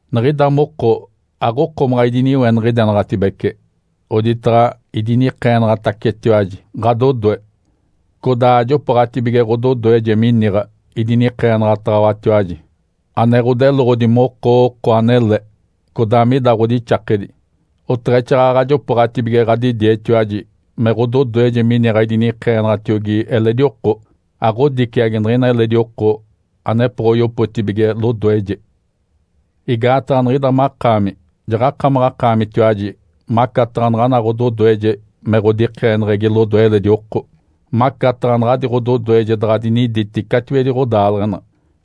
Niɡ̶ida moko aɡ̶okomaɡ̶a idiniweniɡ̶idenaɡ̶atibece oditaɡ̶a idinikeenaɡ̶atacetiwaji ɡ̶adodoe. Codaa ajopooɡ̶atibige ɡ̶ododoeje miniɡ̶a idinikeenaɡ̶ataɡ̶awatiwaji ane ɡ̶odeloɡ̶odi moko oko anele codaa mida ɡ̶odixakedi, oteɡ̶exaaɡ̶aɡ̶a jopooɡ̶atibige ɡ̶adidietiwaji me ɡ̶ododoeje miniɡ̶a idinikeenaɡ̶atiogi eledi oko, aɡ̶odiciagi niɡ̶ina eledi oko anepoɡ̶oyopotibige lodoeje. Igaataɡ̶a niɡ̶ida makaami jaɡ̶akamaɡ̶akaamitiwaji macataɡ̶a naɡ̶ana ɡ̶ododoeje me ɡ̶odikeeneɡ̶egi lodoe eledi oko, macataɡ̶a naɡ̶adi ɡ̶ododoeje daɡ̶a dinidi catiwedi ɡ̶odaaleɡ̶ena,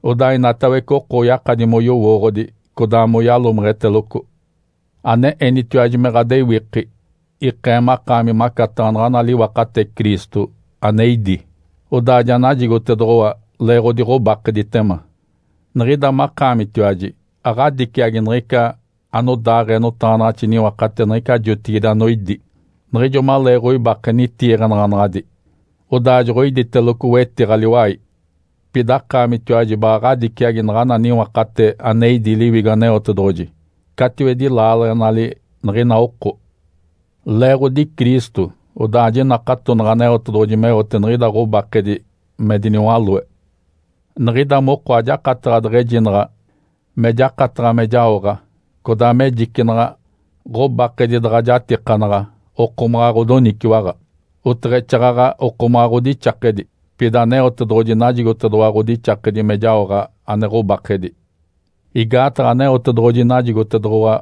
odaa inatawece oko oyakadi moyowooɡ̶odi codaa moyalomeɡ̶eteloco. Ane enitiwaji me ɡ̶adewiki ikee makaami macataɡ̶a naɡ̶ana liwakate Cristo ane idí, odaa ja najigotedoɡ̶owa leeɡ̶odi ɡ̶obakeditema. Niɡ̶ida makaamitiwaji aɡ̶adiciagi niɡ̶ica anodaaɡ̶ee notaɡ̶anaɡ̶axi niwakate niɡ̶ica jotigide anoidi, niɡ̶ijo maleeɡ̶oibake nitiiɡ̶anaɡ̶anaɡ̶adi, odaa joɡ̶oiditeloco wetiɡ̶a liwai. Pida akaamitiwaji baɡ̶a ɡ̶adiciagi naɡ̶ana niwakate ane idi Liwigo Aneotedoɡ̶oji catiwedi laaleɡ̶enali niɡ̶ina oko. Leeɡ̶odi Cristo, odaa jinakatonaɡ̶a Aneotedoɡ̶oji meote niɡ̶ida ɡ̶obakedi me diniwaloe. Niɡ̶ida moko ajakataɡ̶a deɡ̶ejinaɡ̶a me jakataɡ̶a me jaoɡ̶a codaa me jicinaɡ̶a ɡ̶obakedi daɡ̶a jatikanaɡ̶a okomaɡ̶a ɡ̶odoniciwaɡ̶a, oteɡ̶exaaɡ̶aɡ̶a okomaɡ̶a ɡ̶odixakedi. Pida Aneotedoɡ̶oji najigotedoɡ̶owa ɡ̶odixakedi me jaoɡ̶a ane ɡ̶obakedi. Igaataɡ̶a Aneotedoɡ̶oji najigotedoɡ̶owa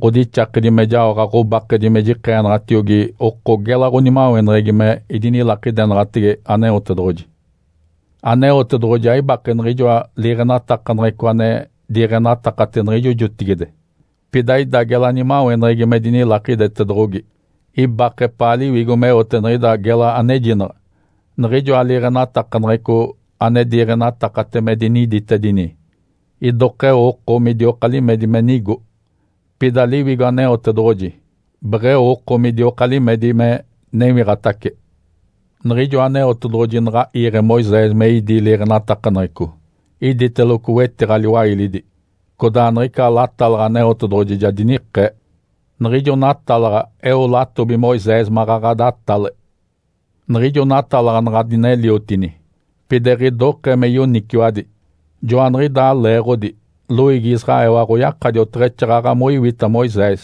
ɡ̶odixakedi me jaoɡ̶a ɡ̶obakedi me jikeenaɡ̶atiogi oko gela ɡ̶onimaweneɡ̶egi me idinilakidenaɡ̶atege Aneotedoɡ̶oji. Aneotedoɡ̶oji aibake niɡ̶ijoa liiɡ̶enatakaneɡ̶eco ane diiɡ̶enatakate niɡ̶ijo jotigide, pida ida gela nimaweneɡ̶egi me dinilakidetedoɡ̶ogi. Ibake epaa Liwigo meote niɡ̶ida gela anejinaɡ̶a. Niɡ̶ijoa liiɡ̶enatakaneɡ̶eco ane diiɡ̶enatakate me diniditedini idokeo oko midioka limedi me nigo. Pida Liwigo Aneotedoɡ̶oji beɡ̶eo oko midioka limedi me newiɡ̶atace. Niɡ̶ijo Aneotedoɡ̶oji naɡ̶a iiɡ̶e Moisés me idí liiɡ̶enatakaneɡ̶eco, iditeloco wetiɡ̶a liwailidi, codaa niɡ̶ica latalaɡ̶a Aneotedoɡ̶oji ja dinikee. Niɡ̶ijo natalaɡ̶a eo latobi Moisés maɡ̶aɡ̶a datale. Niɡ̶ijo natalaɡ̶a naɡ̶a dineliotini, pida eɡ̶idokee me yoniciwadi. Joaniɡ̶idaa leeɡ̶odi loiigi Israel aɡ̶oyakadi oteɡ̶exaaɡ̶aɡ̶a moiwita Moisés.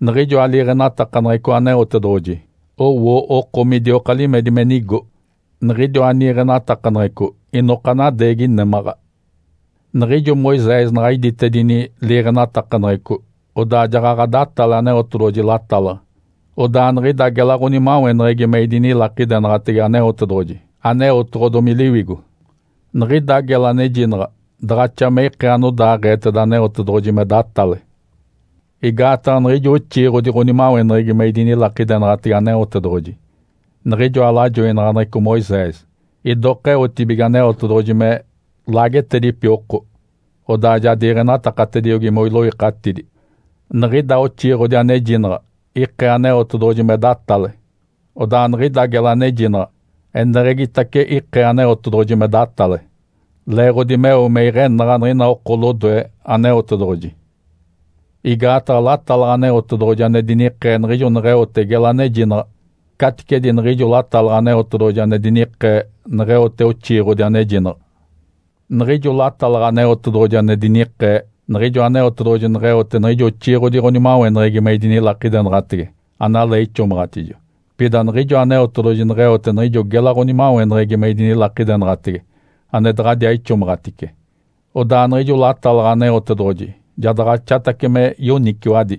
Niɡ̶ijoa liiɡ̶enatakaneɡ̶eco Aneotedoɡ̶oji owo oko midioka limedi me nigo. Niɡ̶idiwa niiɡ̶enatakaneɡ̶eco inoka nadeegi némaɡ̶a. Niɡ̶ijo Moisés naɡ̶a iditedini liiɡ̶enatakaneɡ̶eco, odaa jaɡ̶aɡ̶a datale Aneotedoɡ̶oji latalaɡ̶a. Odaa niɡ̶ida gela ɡ̶onimaweneɡ̶egi me idinilakidenaɡ̶atege Aneotedoɡ̶oji aneotoɡ̶odomi Liwigo, niɡ̶ida gela anejinaɡ̶a daɡ̶axa me ikee anodaaɡ̶eeteda Aneotedoɡ̶oji me datale. Igaataɡ̶a niɡ̶ijo oxiiɡ̶odi ɡ̶onimaweneɡ̶egi me idinilakidenaɡ̶atege Aneotedoɡ̶oji, niɡ̶ijoa lajoinaɡ̶aneɡ̶eco Moisés, idoka eotibige Aneotedoɡ̶oji me laagetedipi oko, odaa ja diiɡ̶enatakatediogi moiloikatidi. Niɡ̶ida oxiiɡ̶odi anejinaɡ̶a ikee Aneotedoɡ̶oji me datale, odaa niɡ̶ida gela anejinaɡ̶a eneɡ̶egitace ikee Aneotedoɡ̶oji me datale, leeɡ̶odi meo me iɡ̶enaɡ̶a niɡ̶ina oko lodoe Aneotedoɡ̶oji. Igaataɡ̶a latalaɡ̶a Aneotedoɡ̶oji ane dinikee niɡ̶ijo neɡ̶eote gela anejinaɡ̶a caticedi niɡ̶ijo latalaɡ̶a Aneotedoɡ̶oji ane dinikee neɡ̶eote oxiiɡ̶odi anejinaɡ̶a. Niɡ̶ijo latalaɡ̶a Aneotedoɡ̶oji ane dinikee, niɡ̶ijo Aneotedoɡ̶oji neɡ̶eote niɡ̶ijo oxiiɡ̶odi ɡ̶onimaweneɡ̶egi me idinilakidenaɡ̶atege analee ixomaɡ̶atijo. Pida niɡ̶ijo Aneotedoɡ̶oji neɡ̶eote niɡ̶ijo gela ɡ̶onimaweneɡ̶egi me idinilakidenaɡ̶atege ane daɡ̶adiaa ixomaɡ̶atice, odaa niɡ̶ijo latalaɡ̶a Aneotedoɡ̶oji ja daɡ̶axatace me yoniciwadi.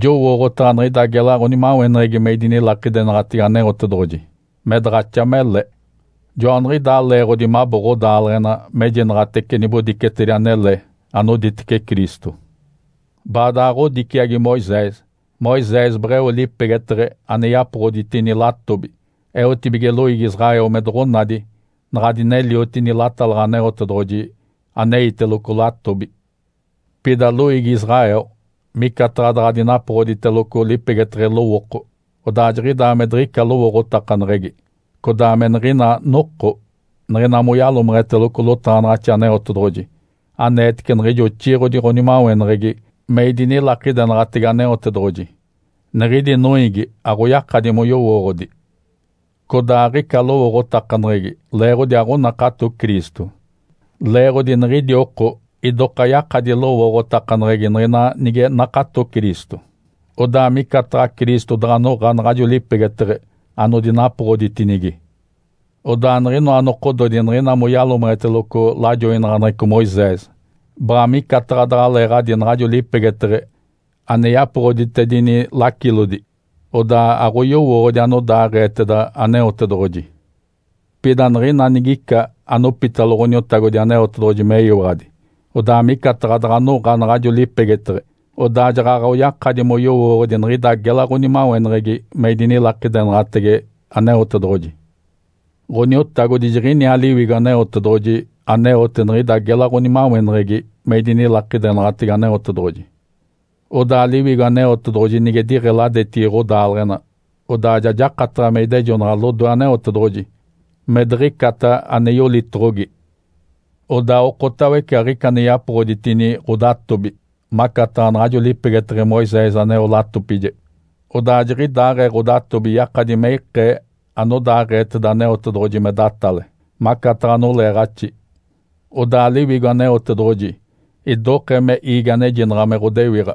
Jowooɡ̶otaɡ̶a niɡ̶ida gela ɡ̶onimaweneɡ̶egi me idinilakidenaɡ̶atege Aneotedoɡ̶oji me daɡ̶axa mele. Joaniɡ̶idaa leeɡ̶odi mabo ɡ̶odaaleɡ̶ena mejinaɡ̶atece nibodicetedi anele anoditece Cristo. Baadaɡ̶a ɡ̶odiciagi Moisés. Moisés beɡ̶eo lipegeteɡ̶e ane yapoɡ̶oditini latobi eotibige loiigi Israel me doɡ̶onadi naɡ̶a dineliotini latalaɡ̶a Aneotedoɡ̶oji aneiteloco latobi. Pida loiigi Israel micataɡ̶a daɡ̶a dinapoɡ̶oditeloco lipegeteɡ̶e lowooko, odaa jiɡ̶idaa me diɡ̶ica lowooɡ̶otakaneɡ̶egi. Codaa me niɡ̶ina noko, niɡ̶ina moyalomeɡ̶eteloco lotaɡ̶anaɡ̶axi Aneotedoɡ̶oji aneetece niɡ̶ijo oxiiɡ̶odi ɡ̶onimaweneɡ̶egi me idinilakidenaɡ̶atege Aneotedoɡ̶oji, niɡ̶idi noiigi aɡ̶oyakadi moyowooɡ̶odi. Codaa aɡ̶ica lowooɡ̶otakaneɡ̶egi leeɡ̶odi aɡ̶onakato Cristo. Leeɡ̶odi niɡ̶idi oko idoka yakadi lowooɡ̶otakaneɡ̶egi niɡ̶ina nige nakato Cristo. Odaa micataɡ̶a Cristo daɡ̶a noɡ̶a naɡ̶ajo lipegeteɡ̶e anodinapoɡ̶oditinigi. Odaa niɡ̶inoa nokododi niɡ̶ina moyalomeɡ̶eteloco lajoinaɡ̶aneɡ̶eco Moisés, baɡ̶a micataɡ̶a daɡ̶aleeɡ̶adi naɡ̶ajo lipegeteɡ̶e ane yapoɡ̶oditedini lacilodi. Odaa aɡ̶oyowooɡ̶odi anodaaɡ̶eeteda Aneotedoɡ̶oji. Pida niɡ̶ina nigica anopitalo Ǥoniotagodi Aneotedoɡ̶oji meyiwaɡ̶adi, odaa micataɡ̶a daɡ̶a noɡ̶a naɡ̶ajo lipegeteɡ̶e, odaa jaɡ̶aɡ̶a oyakadi moyowooɡ̶odi niɡ̶ida gela ɡ̶onimaweneɡ̶egi me idinilakidenaɡ̶atege Aneotedoɡ̶oji. Ǥoniotagodi jiɡ̶iniaa Liwigo Aneotedoɡ̶oji aneote niɡ̶ida gela ɡ̶onimaweneɡ̶egi me idinilakidenaɡ̶atege Aneotedoɡ̶oji. Odaa Liwigo Aneotedoɡ̶oji nige diɡ̶eladetigi ɡ̶odaaleɡ̶ena, odaa ja jakataɡ̶a me idejonaɡ̶a lodoe Aneotedoɡ̶oji me diɡ̶icata ane yolitoɡ̶ogi. Odaa okotawece aɡ̶ica ane yapoɡ̶oditini ɡ̶odatobi macataɡ̶a naɡ̶ajo lipegeteɡ̶e Moisés aneo latopije. Odaa jiɡ̶idaaɡ̶ee ɡ̶odatobi yakadi me ikee anodaaɡ̶eeteda Aneotedoɡ̶oji me datale, macataɡ̶a noleeɡ̶axi. Odaa Liwigo Aneotedoɡ̶oji idokee me iigi anejinaɡ̶a me ɡ̶odewiɡ̶a,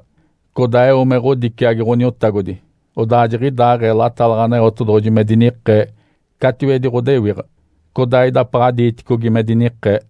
codaa eo me ɡ̶odiciagi Ǥoniotagodi, odaa jiɡ̶idaaɡ̶ee latalaɡ̶a Aneotedoɡ̶oji me dinikee catiwedi ɡ̶odewiɡ̶a, codaa idapaɡ̶a diiticogi me dinikee.